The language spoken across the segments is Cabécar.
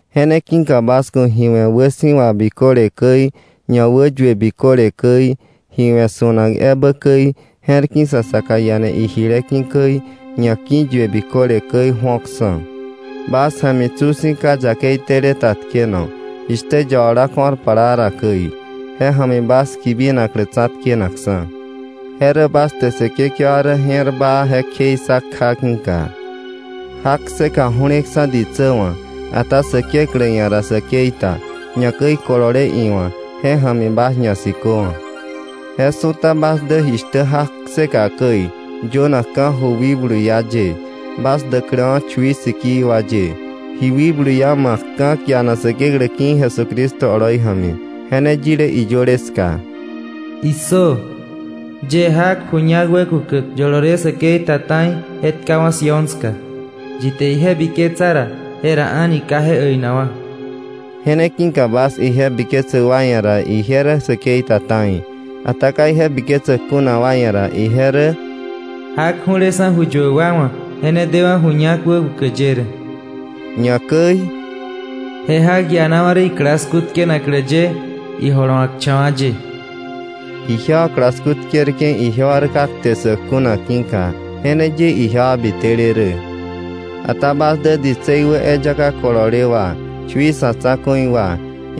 Je ne ki̱ka bas ku̱ ji we̱ wäsi̱wa biköle käi, ñawäyue biköle käi, ji we̱ su̱nak ebä käi, je̱r ki̱ sa saka iane ijile ki̱ käi, ñaki̱yue biköle käi ju̱oksa̱. Bas ja̱mi tsu si̱ ka yakei tele ta tkeno, jishtä yabala ko̱r plaa ra käi, je ja̱mi bas kibinaklä tsa̱tkenakksa̱; je rä bas te Säkekewa rä je̱r baa, je kjei ssa kja ki̱ka. Jak kseka ju̱leksa̱ ditsä wa̱, ata Säkeklä ia̱ ra säkei ta, ñakäi kolole iwa̱, je ja̱mi bas ñasiköwa̱. Je su̱ta bas dä jishtä jak kseka käi, yönakka̱ ju wikblu iá ye, bas däkläwa̱ chui sikii wa ye, ji wikblu iá ma̱kka̱ kianak Säkeklä ki̱ Jesucristo oloi ja̱mi. Je ne yile iyöle ska: “¡Issö! Yie jak ju ñak wäkukäk, yolole säkei ta ta̱i, je tkawa̱ Sión ska; yi te ije biketsa ra, jera a̱ni ka je äinakwa̱.” Je ne ki̱ka bas ije biketsäk wa ia̱ ra, ije rä säkei ta ta̱i, ata ka ije biketsäk kuna wa ia̱ ra, ije rä: “Jak ju̱leksa̱ ju yuäk wa wa̱, je ne dewa̱ ju ñak wäkukäk ye rä”, ñakäi: “Je jak ianawa̱ rä iklasku tkenaklä ye, ijolowa̱kcha̱wa̱ ye.” Ijewa klasku tkerke̱, ijewa rä ka kte ssäk kuna ki̱ka. Je ne ye ijewa bitele rä. Ata bas dä ditsei wä eyaka kolole wa, chui sa̱ tsa̱ku̱i wa,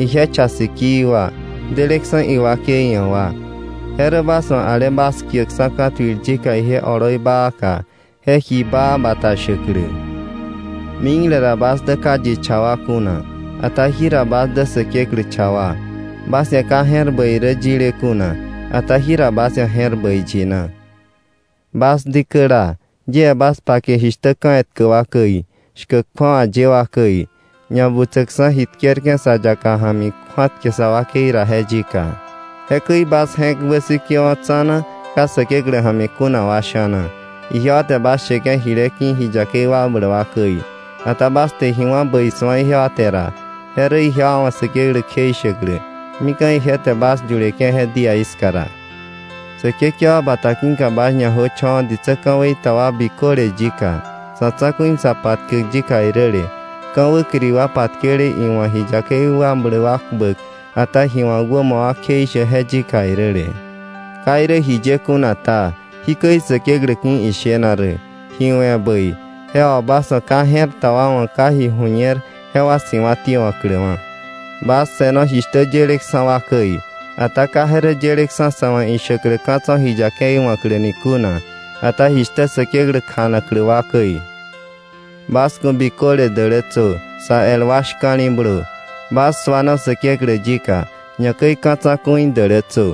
ije cha sikii wa, deleksa̱ iwakei ia̱ wa. Je rä bas wa̱ ale bas kiäkksa̱ ka̱tuil yika ije oloi baaka, je ji baa bata shäklä. Mikle ra bas dä ka yi cha wa kuna, ata jira bas dä Säkeklä cha wa. Bas ia̱ ka je̱r bäi rä yile kuna, ata jira bas ia̱ je̱r bäi yina. Bas dikäla, yie bas pake jishtä ka̱ etkä wa käi, shkäk kju̱awa ye wa käi, ñabutsäkksa̱ ji tkerke̱ sa yaka ja̱mi kju̱atkäke̱ sa wakei ra je yika. Jekäi bas je̱k wäsikewo̱ tsa̱na, ka Säkeklä ja̱mi kuna wa sha̱na. Ijewa te bas sheke̱ jile ki̱ ji yakei wakbläk wa käi. Ata bas te ji wà̱ bäi su̱a ijewa te ra, je rä ijewa wa̱ Säkeklä kjeishäklä, mika̱ ije te bas yuleke̱ je díaí ska ra. Säkekewa bata ki̱ka bas ñajöcho̱wa̱ ditsä ka̱wei ta wa biköle yika, sa̱ tsa̱ku̱i sa patkäk yika iräle, ka̱ wäkiri wa patkele iwa̱ ji yakei wakbläk wa kpäk, ata ji wa̱k wämo wa kjeishäk je yika iräle. Ka irä jiye kuna ta, jikäi Säkeklä ki̱ ishena rä: Ji we̱ bäi, je wà bas wa̱ ka je̱r ta wa wa̱ ka ji ju̱ñer, jewa siwa̱ tiewa̱kläwa̱. Bas se̱no jishtä yeleksa̱ wa käi; ata ka je rä yeleksa̱ sa̱ wa̱ ishäklä ka̱ tso̱ ji yakei wa̱kläni kuna, ata jishtä Säkeklä kjanaklä wa käi. Bas ku̱ biköle dälätsö, sa el wa shka̱li̱blö. Bas suano Säkeklä yika. Ñakäi ka̱ tsa̱ku̱i dälätsö.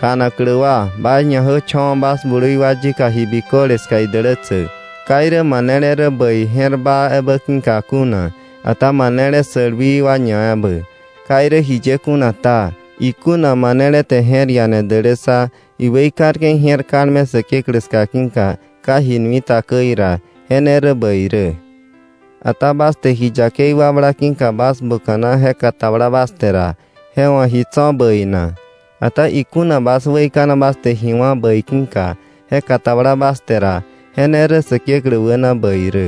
Kjanaklä wa, bas ñajöcho̱wa̱ bas blui wa yika, ji biköle ska idälätsäk, ka irä manele rä bäi, je̱r baa ebä ki̱ka kuna, ata manele sälwii wa ñaebä. Ka irä jiye kuna ta, ikuna manele te je̱r iane dälässa, iweikarke̱ ije̱r kalme Säkeklä ska ki̱ka ka ji nui ta käi ra, je ne rä bäi rä. Ata bas te ji yakei wakbla ki̱ka bas buka̱na je katabla bas te ra, ¿je wa̱ ji tso̱ bäi na? Ata ikuna bas weikana bas te ji wá̱ bäi ki̱ka, je katabla bas te ra, je ne rä Säkeklä wäna bäi rä.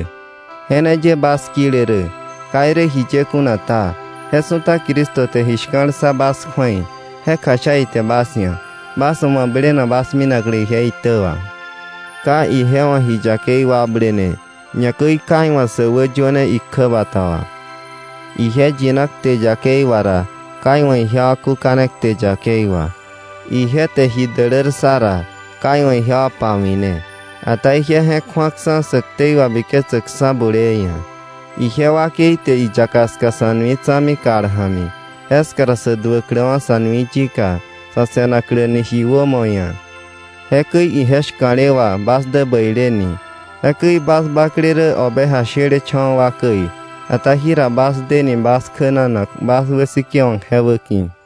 Je ne ye bas kile rä. Ka irä jiye kuna ta, je su̱ta Cristo te ji shka̱l ssa bas kju̱ei, je kjasha ite bas ia̱, bas wa̱ mablenak bas minaklä ije itä wà. Ka ije wa̱ ji yakei wakblene, ñakäi ka iwa̱ sä wäyöne ikjäbata wà. Ije yina kte yakei wà ra, ka iwa̱ ijewa kúkane kte yakei wà. Ije te ji dälär ssa ra, ka iwa̱ ijewa pawi̱ne, ata ije je̱k ju̱aksa̱ sä ktei wabiketsäkksa̱ bulee ia̱. Ije wakei te iyaka ska sa̱ nui tsa̱mi kal ja̱mi, jeska ra sä duäkläwa̱ sa̱ nui yika, sa̱ se̱nakläni ji wämo ia̱. Jekäi ije shka̱le wà bas dä bäileni. Jekäi bas bakle rä oveja shelecha̱wa̱ wa käi, ata jira bas deni bas kjänanak, bas wäsikewa̱k je wäki̱.